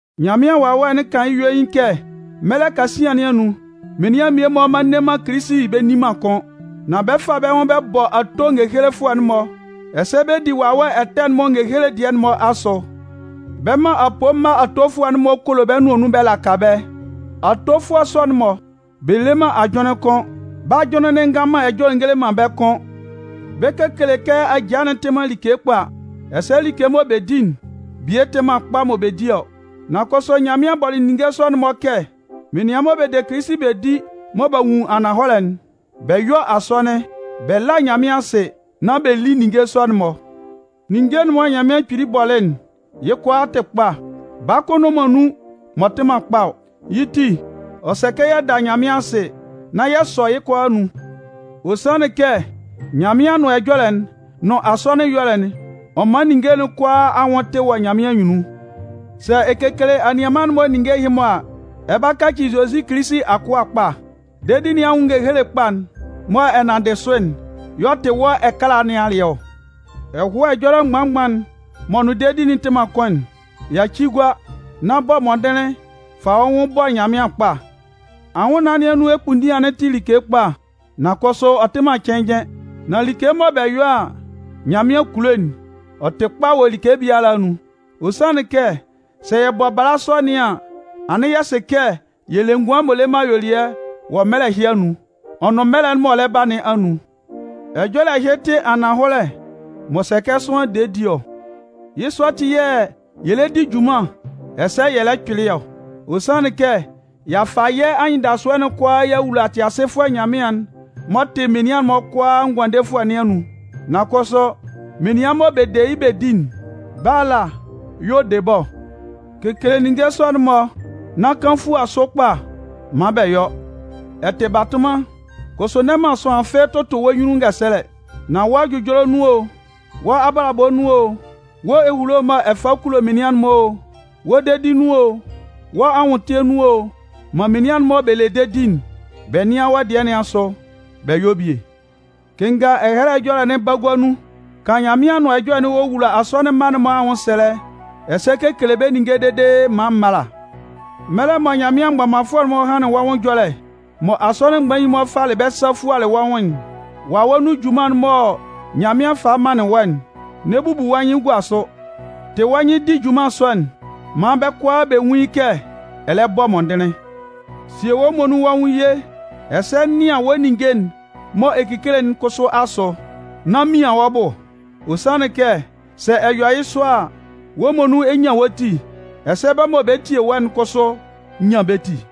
Nyanmɩan Wawɛ'n kan yɩ́ yuein kɛ mɛlɛ kasian nɩn anun, menian mmie-mɔ mma nne man Kilisi bɛ nni man kʋ́n. Nan bɛ 'fa bɛ́ nwʋn bɛ bɔ ato ngehelefʋɛ'n-mɔ, ɛsɛ bɛ 'di wawɛ ɛtɛ'n-mɔ ngehele dɩɛ'n-mɔ asʋ. Bɛ 'man apoo mma atofʋɛ'n-mɔ kolo bɛ́ nʋan nun bɛ laka bɛ́. Atofʋɛ sɔ'n-mɔ, bɛ le man ajʋnlɩn kʋ́n. Bɛ́ ajʋnlɩn'n ngan man ɛjɔlɛ ngele man bɛ́ kʋ́n. Bɛ 'kekele kɛ ajaa'n tɩ man like kpa, ɛsɛ like mɔ bɛ di'n, bie tɩ man kpa mɔ bɛ di ɔ. Nan kʋsʋ Nyanmɩan bɔlɩ ninnge sɔ'n-mɔ kɛ menian mɔ bɛ de Kilisi bɛ di mɔ b'a nwun ananhɔlɛ'n, bɛ yɔ́ asɔnɩn, bɛ lá Nyanmɩan asɩ, nán bɛ lí ninnge sɔ'n-mɔ. Ninnge'n mɔ Nyanmɩan Kpili bɔlɩ'n, yɩ́ kʋalaa tɩ kpa, baa kʋn nnʋn man nun m'ɔ tɩ man kpa ɔ. Yɩ́ ti ɔ sɛ kɛ yɛ da Nyanmɩan asɩ nán yɛ sɔ yɩ́ kʋalaa anun. Ɔ sanlɩn kɛ Nyanmɩan Anʋan Ɛjɔlɛ'n nʋn asɔnɩn ɛyɔlɛ'n, ɔ man ninnge kʋalaa anwʋn tɩ wɔ Nyanmɩan anyunnun. Sɛ ɛ kekele anianman'n-mɔ ninnge ɛhɩ-mɔ a, ɛ 'ba kaci Zozi Kilisi akʋa kpa. Dedi nɩn anwʋn ngehele kpa'n mɔ ɛ nanndɩ sʋ'n y'ɔ tɩ wɔ́ ɛkala nɩn alɩɛ ɔ. Ɛhʋa ɛjɔlɛ mgban-mgban'n m'ɔ nʋn dedi'n tɩ man kʋn'n, yaci gua. Nan bɔ mɔndɩnlɩn fa wɔ́ nwʋn bɔ Nyanmɩan kpa. Anwʋnnaan nɩn anun ekpunndian'n tɩ like kpa, nan kʋsʋ ɔ tɩ man cɩnnjɩn. Nan like mɔ bɛ yɔ a, Nyanmɩan kulo'n, ɔ tɩ kpa wɔ like biala anun. Ɔ sanlɩn kɛ sɛ yɛ bɔ bala sɔ nɩn an, anɩn yɛ sɩ kɛ yɛ le ngʋan m'ɔ le man ayuelɩɛ wɔ mɛlɛ ɛhɩ anun, ɔ nʋn mɛlɛ'n m'ɔ lɛ ba nɩn anun. Ɛjɔlɛ ɛhɩ tɩ ananhɔlɛ m'ɔ sɛ kɛ sʋanlan de di ɔ. Yɩ́ sɔ ati yɛ̂ yɛ lɛ di junman ɛsɛ yɛ lɛ kpɩlɩ ɔ. Ɔ sanlɩn kɛ y'a fa yɛ́ anyɩndasʋɛ'n kʋalaa y'a wula Tɩasɩfʋɛ Nyanmɩan'n m'ɔ tɩ menian'n-mɔ kʋalaa Ngʋandefʋɛ nɩn anun. Nan kʋsʋ, menian mɔ bɛ de yɩ́ bɛ di'n, bɛ́ ala yɛ̂ ɔ de bɛ́ ɔ. Kekele ninnge sɔ'n-mɔ nán kan fua sʋ kpa maan bɛ yɔ́. Ɛ tɩ batʋnman, kʋsʋ n'ɛ man sʋanlan fɩ́ɩ́ tʋtʋ wɔ́ nyunnun ngɛsɛlɛ. Nan wɔ́ ɛjʋjɔlɛ nun o, wɔ́ abalabɔ nun o, wɔ́ ehulo mɔ ɛ fa kulo menian'n-mɔ o, wɔ́ dedi nun o, wɔ́ anwʋntɩɛ nun o, man menian mɔ bɛ le dedi'n, bɛ nɩ́an wɔ́ dɩɛ nɩn asʋ bɛ yɔ́ bie. Kɩnnga Ɛhɛlɛ Ɛjɔlɛ'n bagua nun, kan Nyanmɩan Anʋan Ɛjɔlɛ'n wowula asɔnɩn mma'n-mɔ anwʋnsɛlɛ, ɛsɛ kekele bɛ́ ninnge dede maan m mála. Mɛlɛ mɔ Nyanmɩan mgbɔmanfʋɛ'n-mɔ hanlɩn wɔ́ nwʋn ɛjɔlɛ, mɔ asɔnɩn mgbain'n-mɔ falɩ bɛ́ sa fualɩ wɔ́ nwʋn'n, wawɛ nun junman'n mɔ Nyanmɩan falɩ manlɩn wɔ́'n, n'ɛ bubu wɔ́ nyɩn gua sʋ. Tɩ wɔ́ nyɩn di junman sɔ'n maan bɛ́ kʋalaa bɛ nwún yɩ́ kɛ ɛ lɛ bɔ mɔndɩnlɩn. Sie wɔ́ muonun wɔ́ nwʋn ye, ɛsɛ nɩan wɔ́ ninnge'n mɔ ɛ kekele'n kʋsʋ asʋ, nán mian wɔ́ bʋ. Ɔ sanlɩn kɛ, sɛ ɛ yɔ yɩ́ sɔ a, wɔ́ muonun ɛ 'nyan wɔ́ ti, ɛsɛ bɛ́ mɔ bɛ tie wɔ́'n kʋsʋ 'nyan bɛ́ ti.